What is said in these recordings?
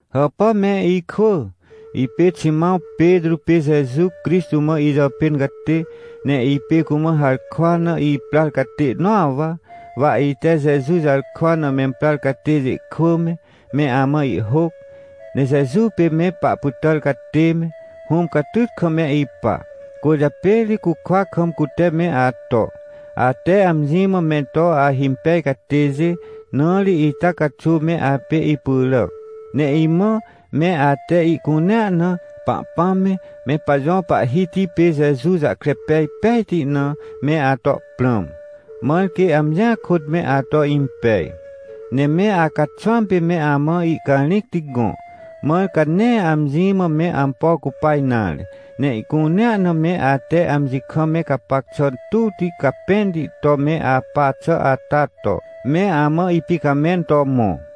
Hàpà me ikwỳ! Ipê Ximãw Petrô pê Jeju Crixtô mã ijàpên catê, ne ipê cumã harkwa na iprar catê nõa wa. Wa ite Jeju jarkwa na memprar catêjê kwỳ me, me amã ihhôc. Ne Jeju pê me pahpytàr catê me, Hũm catyt kam me ipa. Cwỳrjapê ri cukwa kam cute me ato, ate amji mã me to ahimpej catêjê. Na ri ita caxuw me apê ipyràc. Ne imã, me ate ihcunea na, Pahpãm me, me pajõ Pahhiti pê Jeju jahkre pej pejti na, me ato prãm. Mãr quê amjia kôt me ato impej, ne me acaxwãm pê me amã ihcarĩcti gõ, mãr ca nee amji mã me ampo cupa nare, ne ihcunea na me ate amji kam me gapac xà tuwti capẽnti to me apa xà ata to, me amã ipicamẽn to mõ.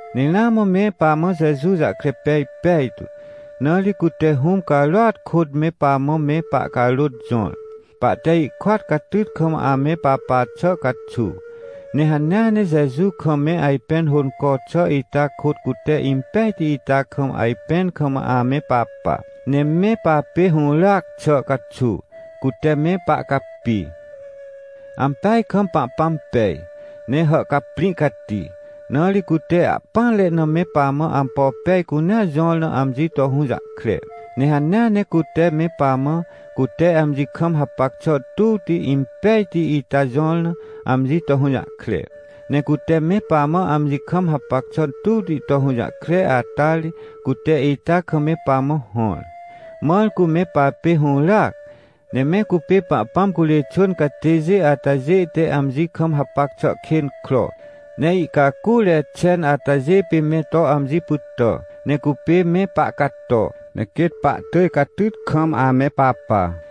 Ne ramã me pamã Jeju jahkre pej pejtu, na ri cute Hũm carôat kôt me pamã me pahcarôt jõr, pahte ihkôat catyt kam ame papa xà caxuw. Ne hanea ne Jeju kam me ajpẽn hônco xà ita kôt cute impejti ita kam ajpẽn kam ame papa, ne me papê hũràac xà caxuw, cute me pahcapi. Ampeaj kam Pahpãm pej, ne hàhcaprĩ cati, na ri cute ahpỹanre na me pamã ampo pej cunea jõr na amji to hũjahkre. Ne hanea ne cute me pamã, cute amji kam hapac xà tuwti, impejti ita jõr na, amji to hũjahkre. Ne cute me pamã amji kam hapac xà tuwti to hũjahkre ata ri, cute ita kam me pamã hõr, mãr cu me papê hũràac, ne me cupê Pahpãm curê xwỳn catêjê atajê te amji kam hapac xà kên kro, ne ihcacure xen atajê pê me to amji pytà, ne cupê me pahcato, ne quêt pahtỳj catyt kam ame papa.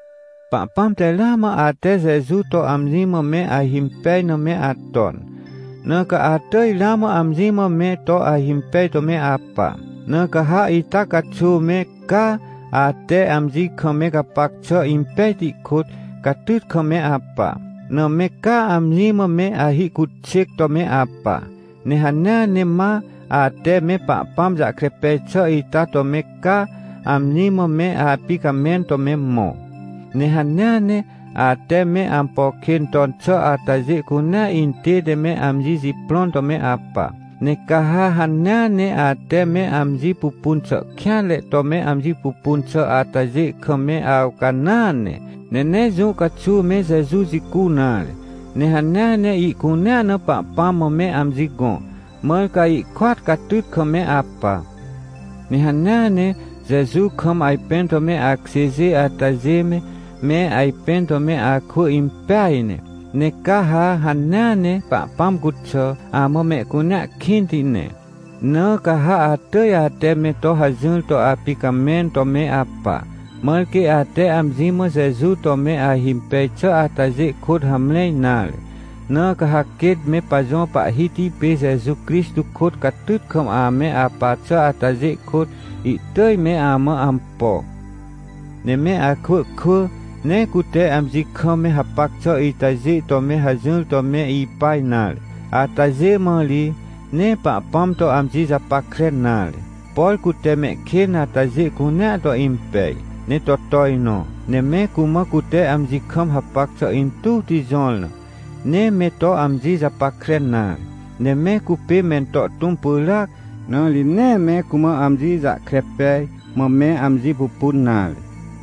Pahpãm te ramã ate Jeju to amji mã me ahimpej na me aton, na ca atỳj ramã amji mã me to ahimpej to me apa. Na ca ha ita caxuw me caa, ate amji kam me gapac xà impejti kôt, catyt kam me apa. Na me caa amji mã me ahihcuxêc to me apa. Ne hanea ne ma, ate me Pahpãm jahkre pej xà ita to me caa, amji mã me apicamẽn to me mõ. Ne hanea ne, ate me ampo kên ton xà atajê cunea intête me amji jiprõn to me apa. Ne ca ha hanea ne ate me amji pupun xà kêanre to me amji pupun xà atajê kam me awcanãa ne, ne nee jũ caxuw me Jeju jicu nare. Ne hanea ne ihcunea na Pahpãm mã me amji gõ, mãr ca ihkôat catyt kam me apa. Ne hanea ne, Jeju kam ajpẽn to me akjêjê atajê me, me ajpẽn to me akwỳ impeaj ne. Ne ca ha hanea ne Pahpãm cuxà, amã mehcunea kĩnti ne. Na ca ha atỳj ate me to hajỹr to apicamẽn to me apa, mãr quê ate amji mã Jeju to me ahimpej xà atajê kôt hamre nare. Na ca ha quêt me pajõ Pahhiti pê Jeju Crixtô kôt catyt kam ame apa xà atajê kôt, ihtỳj me amã ampo. Ne me akwỳ kwỳ, nee cute amji kam me hapac xà itajê to me hajỹr to me ipa nare. Atajê mã ri, nee Pahpãm to amji japackre nare. Por cute mehkên atajê cunea to impej, ne to tojnõ, ne me cumã cute amji kam hapac xà intuwti jõr na, nee me to amji japackre nare. Ne me cupê mento tũm pyràac, na ri nee me cumã amji jahkre pej, mã me amji pupun nare.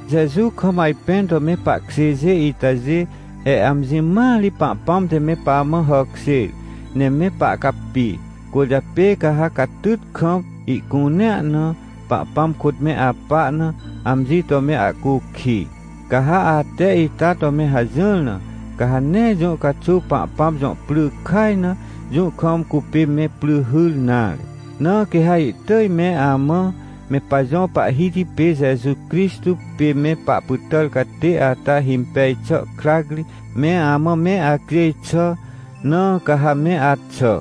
Jeju kam ajpẽn to me pahkjêjê itajê, he amji mãa ri Pahpãm te me pamã hàkjêr, ne me pahcapi, cwỳrjapê ca ha catyt kam, ihcunea na, Pahpãm kôt me apa na, amji to me ahcukij. Ca ha ate ita to me hajỹr na, ca ha nee jũ caxuw Pahpãm jõ pry kaj na, jũ kam cupê me pry hyr nare. Na quê ha ihtỳj me amã, me pajõ Pahhiti pê Jeju Crixtô pê me pahpytàr catê ata himpej xà krac ri, me amã me acjêj xà. Na ca ha me axà,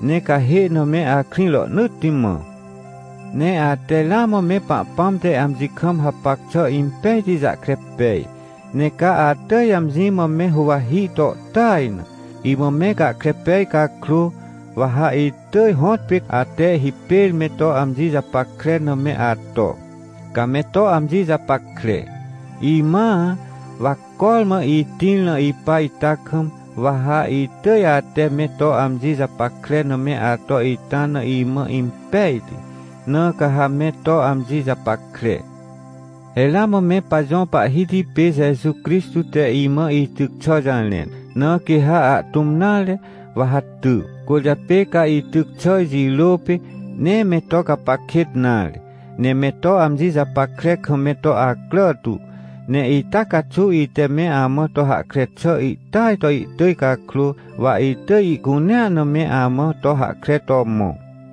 ne cahê na me akrĩ rohnỳtti mã. Ne ate ramã me Pahpãm te amji kam hapac xà impejti jahkre pej. Ne ca atỳj amji mã me huwahi to tỳj na, imã me gahkre pej cakrô, wa ha itỳj hõtpê ate hipêr me to amji japackre na me ato, ca me to amji japackre. Imãa, wa cormã itĩr na ipa ita kam, wa ha itỳj ate me to amji japackre na me ato ita na imã impejti, na ca ha me to amji japackre. He ramã me pajõ Pahhiti pê Jeju Crixtô te imã ityc xà jarẽn, na quê ha ahtũm nare, wa ha ty. Cwỳrjapê ca ityc xà jirô pê, nee me to gapac kêt nare, ne me to amji japackre kam me to acrà tu. Ne ita caxuw ite me amã to hahkre xà ihtỳaj to ihtỳj cakrô, wa itỳj ihcunea na me amã to hahkre to mõ.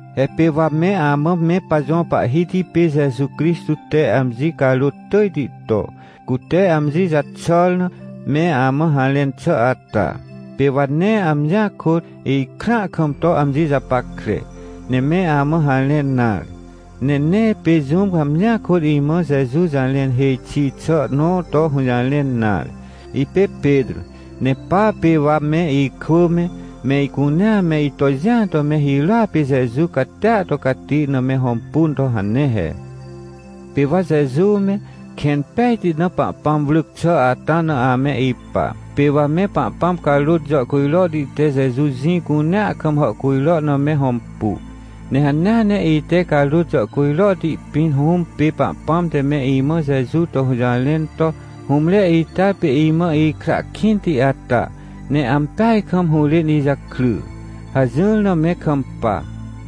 He pê wa me amã me pajõ Pahhiti pê Jeju Crixtô te amji carôt tỳjti to, cute amji jaxàr na, me amã harẽn xà ata, pê wa nee amjia kôt, ikrãa kam to amji japackre, ne me amã harẽn nare. Ne nee pê jũm amjia kôt imã Jeju jarẽn hêj xi xà nõ to hũjarẽn nare. Ipê Petrô, ne pa pê wa me ikwỳ me, me icunea me ito jĩa to me hirôa pê Jeju catia to cati na me hõmpu to hane he. Pê wa Jeju me, kẽn pejti na Pahpãm wrỳc xà ata na ame ipa, pê wa me Pahpãm carôt jàhcujrohti te Jeju jĩ cunea kam hàhcujro na me hõmpu. Ne hanea ne ite carôt jàhcujrohti pĩn Hũm pê Pahpãm te me imã Jeju to hũjarẽn to: — Hũmre ita pê imã ikra kĩnti ata, ne ampeaj kam hũrên ijakry — hajỹr na me kampa.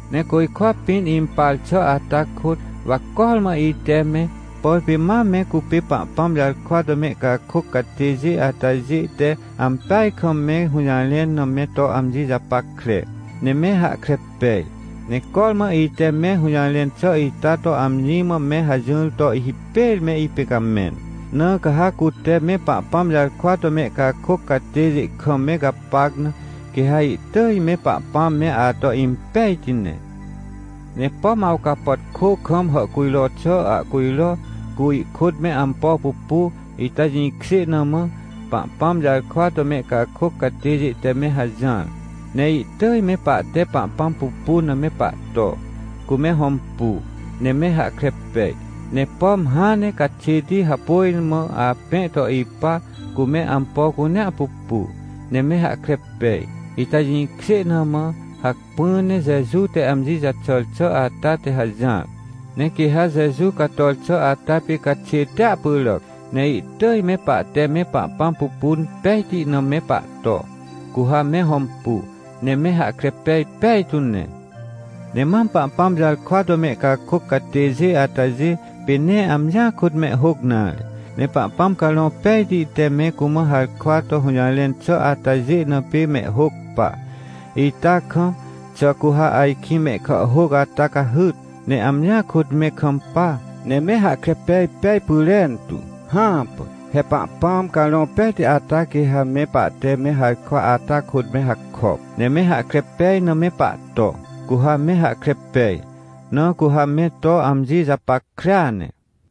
Ne côjkwa pĩn impar xà ata kôt, wa cormã ite me, por pê mam me cupê Pahpãm jarkwa to mehcakôc catêjê atajê te ampeaj kam me hũjarẽn na me to amji japackre, ne me hahkre pej. Ne cormã ite me hũjarẽn xà ita to amji mã me hajỹr to hipêr me ipicamẽn. Na ca ha cute me Pahpãm jarkwa to mehcakôc catêjê kam me gapac na, quê ha ihtỳj me Pahpãm me ato impejti ne. Ne pom awcapàtkô kam hàhcujro xà ahcujro, cu ihkôt me ampo pupu, ita jĩkjê na mã, Pahpãm jarkwa to mehcakôc catêjê te me hajỹar, ne ihtỳj me pahte Pahpãm pupun na me pahto, cu me hõmpu, ne me hahkre pej. Ne pom hãn ne caxêti hapôj mã apẽ to ipa, cu me ampo cunea pupu, ne me hahkre pej, ita jĩkjê na mã, hacpỹ ne Jeju te amji jaxàr xà ata te hajỹar. Ne quê ha Jeju cator xà ata pê caxêtia pyràc, ne ihtỳj me pahte me Pahpãm pupun pejti na me pahto, cu ha me hõmpu, ne me hahkre pej pejtu ne. Ne mam Pahpãm jarkwa to mehcakôc catêjê atajê, pê nee amjia kôt mehhôc nare. Ne Pahpãm Carõ Pejti te me cumã harkwa to hũjarẽn xà atajê na pê mehhôc pa. Ita kam, xà cu ha ajkĩ mehkàhhôc ata cahyt, ne amjia kôt me kampa, ne me hahkre pej pej pyrentu? Hãpà! He Pahpãm Carõ Pejti ata quê ha me pahte me harkwa ata kôt me hakop, ne me hahkre pej na me pahto, cu ha me hahkre pej, na cu ha me to amji japackrea ne.